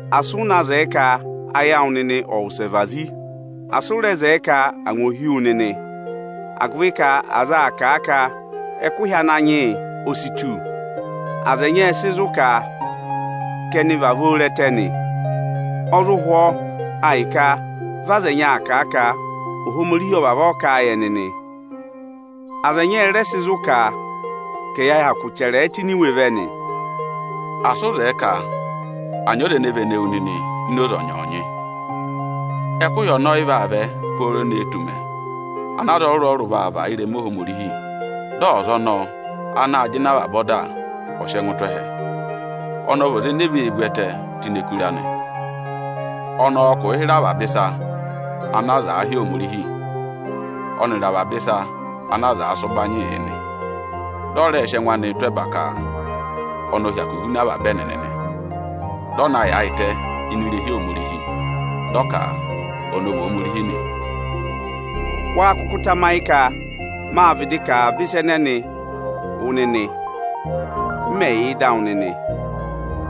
asị ụ na zẹẹ ka ayị awụ nịnị ọ̀ wụsẹ vazi. Asị ụ rẹ zẹẹ ka angwa ò hí wu nịnị, agụvị ka aza aa kà a ka ẹkụhị Ananyị yị o si tu. Aza ẹnyị ẹ zụ kà a ka vị ẹnị vavọọ re ẹtẹ nị. Ọ zụ hwọọ a hị́ ka vị aza ẹnyị aa kà a ka Ohomorihi ọ vavọọ kà a yị ẹnị nị. Aza ẹnyị ẹ rẹ zụ kà a ka ẹyị hyakụ chẹrẹ ẹ tụ́ ini iwe vẹ nị. Asị ụ zẹẹ ka à nyị ọza ene vene wu nịnị ini oze ọnyọọnyị o. Ẹkụhị ọnọọ ọ́ yị vaa vẹ ne tù ụmẹ ana aza ọrụrụ-ọrụrụ vaa và ịrẹma Ohomorihi, dị ọza ọnọọ anaā jịnẹ avaba ọda ọ̀ sị ẹngụ anị tụ́ ẹhẹ. Ọnị ọ vị ọza ene vee vú ẹtẹẹ tụ́ ini ẹkụra nị. Ọnị ọọ̄ kụ̀ụ hịrẹ avaba ịsa ana aza aa hị́ Ohomorihi, ọnịrị avaba ịsa ana aza aa sị ụbanyịị yị. Dị ọ rẹ sị ẹngụ anị tụ́ ẹba ka ọnị ọ hyakụ huna avaba ẹnịnị nị. Ọ vá naa yaayịtẹ ini irehi Ohomorihi, dị ọ ka ọnị ọ vị Ohomorihi nị. Wáá kụkụ tamayị ka máa vịdị kà avaba ịsa ẹnẹnịị wụ nịnị, m mẹ̀ yà ịdị awụ nịnị?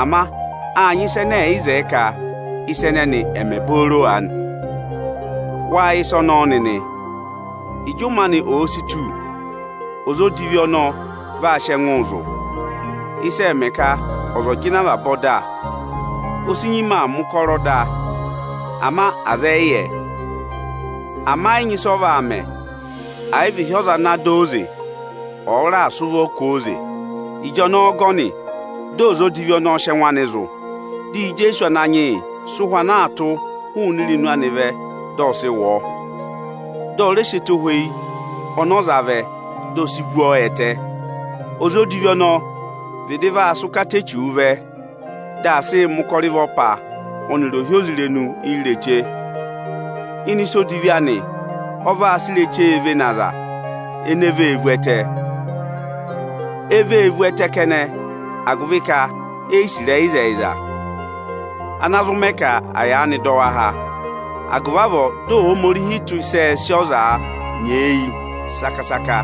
Ama áa nyị ịsa ẹnẹ ẹ̀yị zẹẹ ka ịsa ẹnẹnị ẹ̀ mẹ booro aanị. Wáa yẹ ịsa ọnọọ nịnị. Ịjị ụmẹ anị òo si tù, ọza odivi ọnọọ vaa sị ẹngụụ zụ̀. Ịsị ẹẹ̄ mẹ ka ọza ọ̀ jịnẹ avaba ọda o si nyima aa mẹ̀ ụkọrọ da, ama aza ẹyị yẹ. Ama ẹ́ yị nyị ịsị ọ vaa mẹ, àyị vị ịhị ọza ana sị ụvọ jị ọ oze, ọ̀ọ raà sị ụvọ kwooze. Ịjọnọọ ọgọnị dị ọza odivi ọnọọ sị ẹngụ anị zụ̀. Dị Ijeesu Ananyị yị sị ụhwẹ ana aa tụ́ụ hụụnị irenu anịị vẹ, dị ọ sị wụ ọọ. Dị ọ rẹ sị ẹtohweyi ọnị ọ za vẹ, di o si vú ọ ẹtẹ. Ọza odivi ọnọọ vịdị vaa sị ụkata Echuu vẹ, dị aa sịị mẹ̀ ụkọrọ ịvọpa ọnịrị ohyozirenu ireche. Ịnị ịsa odivi anị, ọ vaa sị irechee vene aza ene vee vụ ẹtẹ. E vee vu ẹtẹ kẹnẹ, agụvị ka ẹnịnị e yi sì ịrẹyị ịzẹyịza, ana zụ mẹ ka à yaanị dọ wa há. Agụvị avọọ dị Ohomorihi tụ́ ịsị ẹẹ̄ sị ọzaa nyeeyi saka-saka,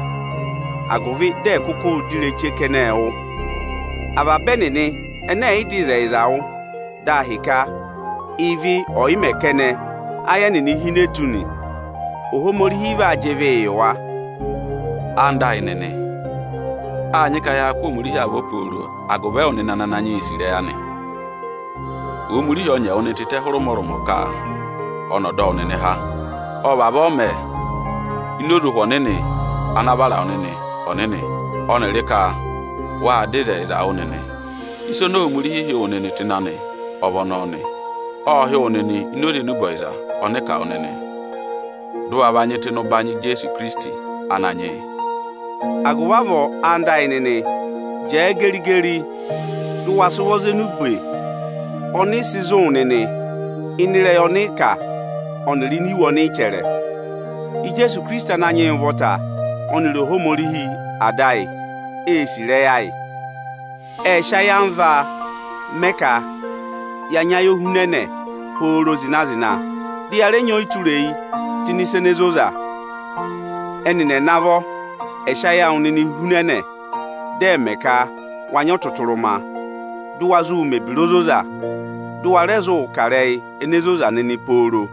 agụvị dị ẹ̀ kụkụụ dọ ịrẹyị ireche kẹnẹẹ wụ́ nị. Avaba ẹnịnị ẹnẹ ẹ̀ yị dọ ịzẹyịza wụ́ dị a hịka ịvị ọyị mẹ kẹnẹ áyị ẹnịnị hine tụ́ nị, Ohomorihi vaa jị ịvịị yị wa. Ẹwụ nịnị ẹyịnyara amị, áa nyị ka yaa kụ́ Ohomorihi avọ pooro agụvị awụ nịnị ana Ananyị yị sì ịrẹyị anị. Ohomorihi ọ nyị ẹwụ nịnị tịtẹ hụrẹ ụmọrụmọ ka ọnị ọ̀ dọ wụ nịnị há nị. Ọ́ vavọọ mẹ ini oze Ụhwẹ Ọnịnị ana vara wụ nịnị ọnịnị ọnịrị ka wâ dọ ịzẹyịza wụ́ nịnị. Ịsa oni Ohomorihi hị́ wụ nịnị tụ́ ịnị anị, ọ vị ọnọọ nị. Ộ hị́ wụ nịnị ini oze enube ọyịza ọnị ị kà wụ nịnị, dị ụ wa va nyị tụ́ ịnị ụbanyị Ijeesu Ikirisiti Ananyị yị. Agụvị avọọ, anda ayị nịnị, jẹẹ geri-geri, dị ụ wa sị ụvọ za enube ọnị ị sị zụ̀ wụ nịnị ịnị ịrẹyị ọnị ị kà ọnịrị ini iwe ọnị ị chẹrẹ! Ijeesu Ikirisiti Ananyị yị ụvọta ọnịrị Ohomorihi Ada ayị ée sì ịrẹyị ayị. Ệ vayị ka ya nyị ayohunẹnẹ pooro zịna-zịna, dị ya rẹ nyị ọyịtureyi tụ́ ịnị ịsa ene zoza. Ẹnịnị ẹ̀ navọ ẹ̀ sị ayị awụ nịnị hunẹnẹ, dị ẹ̀ mẹ ka wa nyị ọtụtụrụma, dị ụ wa zụụ mẹ̀ ebira ozoza, dị ụ wa rẹ zụụ kà ịrẹyị ene zoza nịnị pooro!